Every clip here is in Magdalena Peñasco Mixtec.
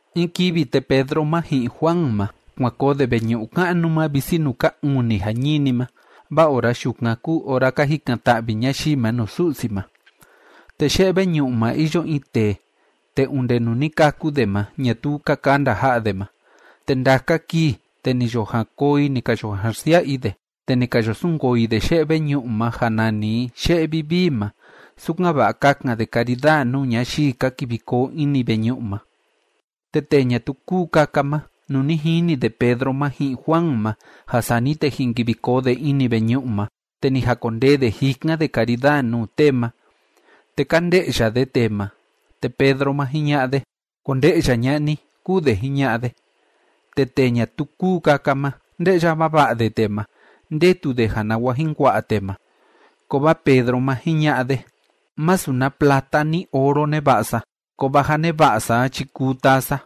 In kivi, te Pedro ma ji'in Juan ma, kuan koo de veñu'u ka'nu ma visi nuu ka uni jañini ma, vaa ora yukan kúu ora ka jikan‑ta'vi ñayii ma nuu Su'si ma. Te ye'e veñu'u ma iyo in tee, te onde nuu ni kâku de ma, ñatuu ka kanda ja'a de ma. Te ndaka kii, te ni yo jan koo i ni ka yo jan xsia'a i de, te ni ka yo sunkoo i de ye'e veñu'u ma ja nani i “Ye'e Vivii” ma, sukan‑va'a kakan de karidaa nuu ñayii ka kivi koo ini veñu'u ma. Te tee ñatuu kúu kaka ma, nuu ni jini de Pedro ma ji'in Juan ma, ja sani te jin kivi koo de ini veñu'u ma, te ni jakondee de jikan de karidaa nuu tee ma. Te ka nde'ya de tee ma, te Pedro ma, jiña'a de: ―Konde'ya ña'a ni ―kúu de jiña'a de. Te tee ñatuu kúu kaka ma, nde'ya vava'a de tee ma. Ndetu de ja nawa jin kua'a tee ma. Kovaa Pedro ma, jiña'a de: ―Masu na plata ni oro neva'a sa, kovaa ja neva'a sa a chi kuu taa sa.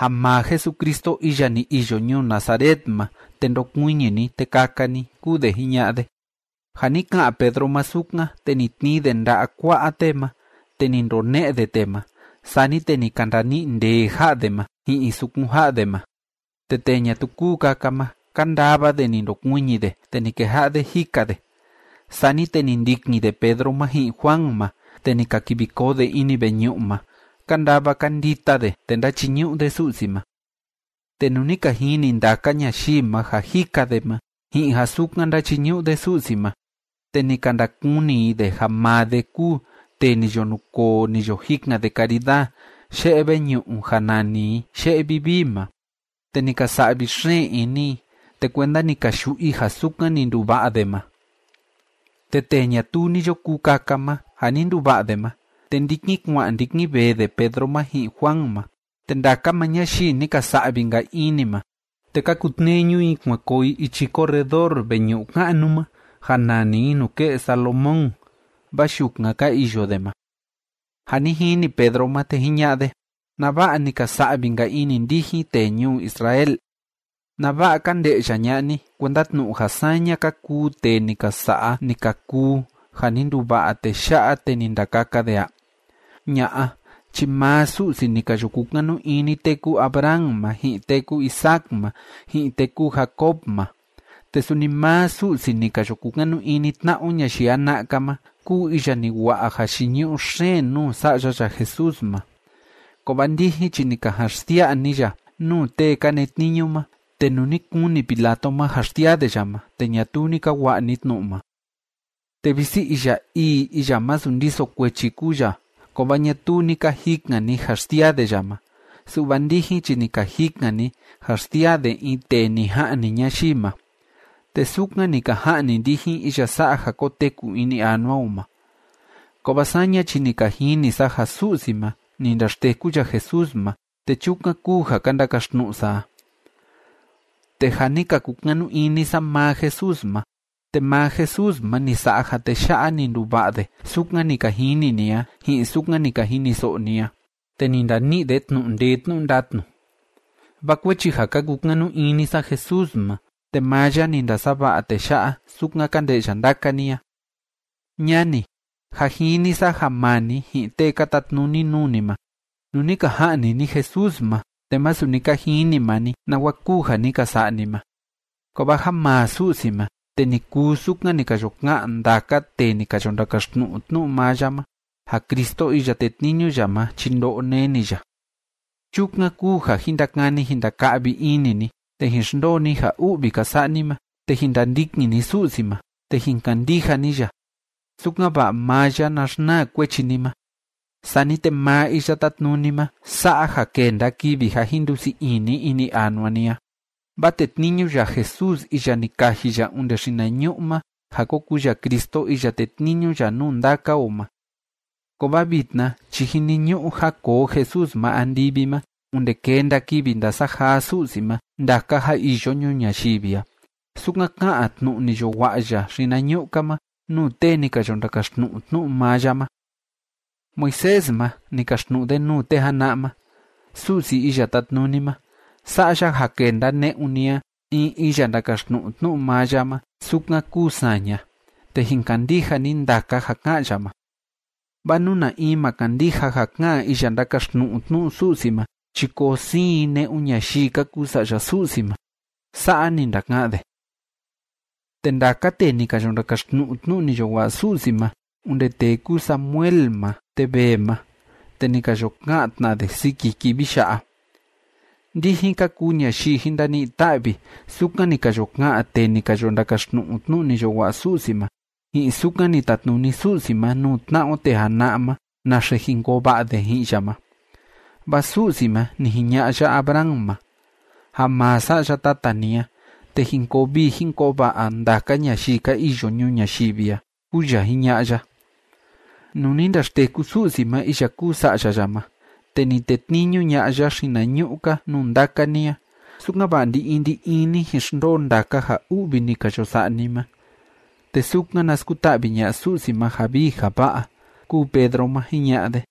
Ja maa Jesucristo iya ni iyo ñuu Nazaret ma, te ndokuiñi ni, te kaka ni ―kúu de jiña'a de. Ja ni ka'an Pedro ma sukan, te ni tnii de nda'a kua'a tee ma, te ni ndone'e de tee ma. Sani te ni ka ndani'i ndee ja'a de ma ji'in sukun ja'a de ma. Te tee ñatuu kúu kaka ma, kándava de ni ndokuiñi de, te ni keja'a de jika de. Sani te ni ndikin de Pedro ma ji'in Juan ma, te ni ka kivi koo de ini veñu'u ma. Kándava kándita de, te ndáchiñu'u de Su'si ma. Te nuu ni ka jini ndaka ñayii ma ja jika de ma ji'in ja sukan ndáchiñu'u de Su'si ma, te ni ka ndakuni i de ja maa de kúu tee ni yo nukoo ni yo jikan de karidaa ye'e veñu'u ja nani i “Ye'e Vivii” ma. Te ni ka sa'vi xeen ini i, te kuenda ni ka yu'u i ja sukan ni nduva'a de ma. Te tee ñatuu ni yo kuu kaka ma, ja ni nduva'a de ma, te ndikin kua'an ndikin vee de Pedro ma ji'in Juan ma, te ndaka maa ñayii ni ka sa'vi‑nka ini ma, te ka kutneñu i kuan koo i ichi corredor veñu'u ka'nu ma ja nani i “Nuke'e Salomón”, vaa yukan ka iyo de ma. Ja ni jini Pedro ma, te jiña'a de: ―¿Nava'a ni ka sa'vi‑nka ini ndijin, tee ñuu Israel? ¿Nava'a ka nde'ya ña'a ni, kuenda tnu'u ja saña ka kuu tee ni ka sa'a, ni ka kuu ja ni nduva'a tee ya'a te ni ndakaka de a? Ña'a chi maa Su'si ni ka yo kukanu ini tee kúu Abraham ma, ji'in tee kúu Isaac ma, ji'in tee kúu Jacob ma, te suni maa Su'si ni ka yo kukanu ini tna'a o ñayii jana'a‑ka ma, kúu iya ni wa'a jayiñu'u xeen nuu Sa'ya ya Jesús ma. Kovaa ndijin chi ni ka jan xsia'a ni ya nuu tee ka netniñu ma. Te nuu ni kuni Pilato ma ja xsiaa de ya ma, te ñatuu ni ka wa'a ni tnu'u ma. Te visi iya ii iya masu ndiso kuechi kúu ya, kovaa ñatuu ni ka jikan ni ja xsiaa de ya ma, su'va ndijin chi ni ka jikan ni ja xsiaa de in tee ni ja'ni ñayii ma. Te sukan ni ka ja'ni ndijin iya sa'a ja koteku ini anua o ma. Kovaa saña chi ni ka jini sa ja Su'si ma, ni ndaxteku ya Jesús ma, te chukan kúu ja ka ndakaxtnu'u sa a. Te ja ni ka kukanu ini sa maa Jesús ma, te maa Jesús ma ni sa'a ja tee ya'a, ni nduva'a de, sukan ni ka jini ni a, ji'in sukan ni ka jiniso'o ni a. Te ni ndani'i de tnu'u ndee tnu'u ndatnu. Vaa kuechi ja ka kukanu ini sa Jesús ma, te maa ya ni ndasava'a tee ya'a, sukan ka nde'ya ndaka ni a. ’Ñani, jâ jini sa ja maa ni ji'in tee ka tatnuni nuu ni ma, nuu ni ka ja'ni ni Jesús ma, te masu ni ka jini maa ni nawa kúu ja ni ka sa'a ni ma. Kovaa ja maa Su'si ma, te ni kuu sukan ni ka yo ka'an ndaka tee ni ka yo ndakaxtnu'u tnu'u maa ya ma ja Cristo iya tetniñu ya ma chi ndo'o neni ya. Chukan kúu ja jin ndakani jin ndaka'vi ini ni, te jin xndoo ni ja u'vi ka sa'a ni ma, te jin ndandikin ni Su'si ma, te jin kandija ni ya, sukan‑va'a maa ya na xnaa kuechi ni ma. Sani te maa Iya Tátnuni ma sa'a ja kenda kivi ja jin ndusii ini ini anua ni a. Vaa tetniñu ya Jesús iya ni kaji ya onde xinañu'u ma ja ko kuu ya Cristo iya tetniñu ya nuu ndaka o ma. Kovaa vitna chi jiniñu'u ja koo Jesús ma andivi ma onde kenda kivi ndasajaa Su'si ma ndaka ja iyo ñuu ñayivi a, sukan ká'an tnu'u ni yo wa'a ya xinañu'u‑ka ma nuu tee ni ka yo ndakaxtnu'u tnu'u maa ya ma. Moisés ma, ni kaxtnu'u de nuu tee jana'a ma: “Su'si Iya Tátnuni ma, sa'a ya ja kenda ne'un ni a in iya ndakaxtnu'u tnu'u maa ya ma sukan kúu saña, te jin kandija ni ndaka ja ka'an ya ma. Vaa nú na in ma kandija ja ka'an iya ndakaxtnu'u tnu'u Su'si ma chi koo siin i ne'un ñayii ka kuu sa'ya Su'si ma.” Sa'a ni ndaka'an de. ’Te ndaka tee ni ka yo ndakaxtnu'u tnu'u ni yo wa'a Su'si ma onde tee kúu Samuel ma te vee ma, te ni ka yo ka'an tna de siki kivi ya'a. Ndijin ka kuu ñayii jin ndani'i ta'vi, sukan ni ka yo ka'an tee ni ka yo ndakaxtnu'u tnu'u ni yo wa'a Su'si ma, ji'in sukan ni tatnuni Su'si ma nuu tna'a o tee jana'a ma naxe jin koo va'a de ji'in ya ma. Vaa Su'si ma, ni jiña'a ya Abraham ma: “Ja maa Sa'ya tata ni a, te jin koo vii jin koo va'a ndaka ñayii ka iyo ñuu ñayivi a”, kúu ya jiña'a ya. Nuu ni ndaxteku Su'si ma iya kúu Sa'ya ya ma, te ni tetniñu ña'a ya xinañu'u‑ka nuu ndaka ni a, sukan‑va'a ndi‑in ndi‑in ni jin xndoo ndaka ja u'vi ni ka yo sa'a ni ma, te sukan na skuta'vi ña'a Su'si ma ja vii ja va'a ―kúu Pedro ma jiña'a de.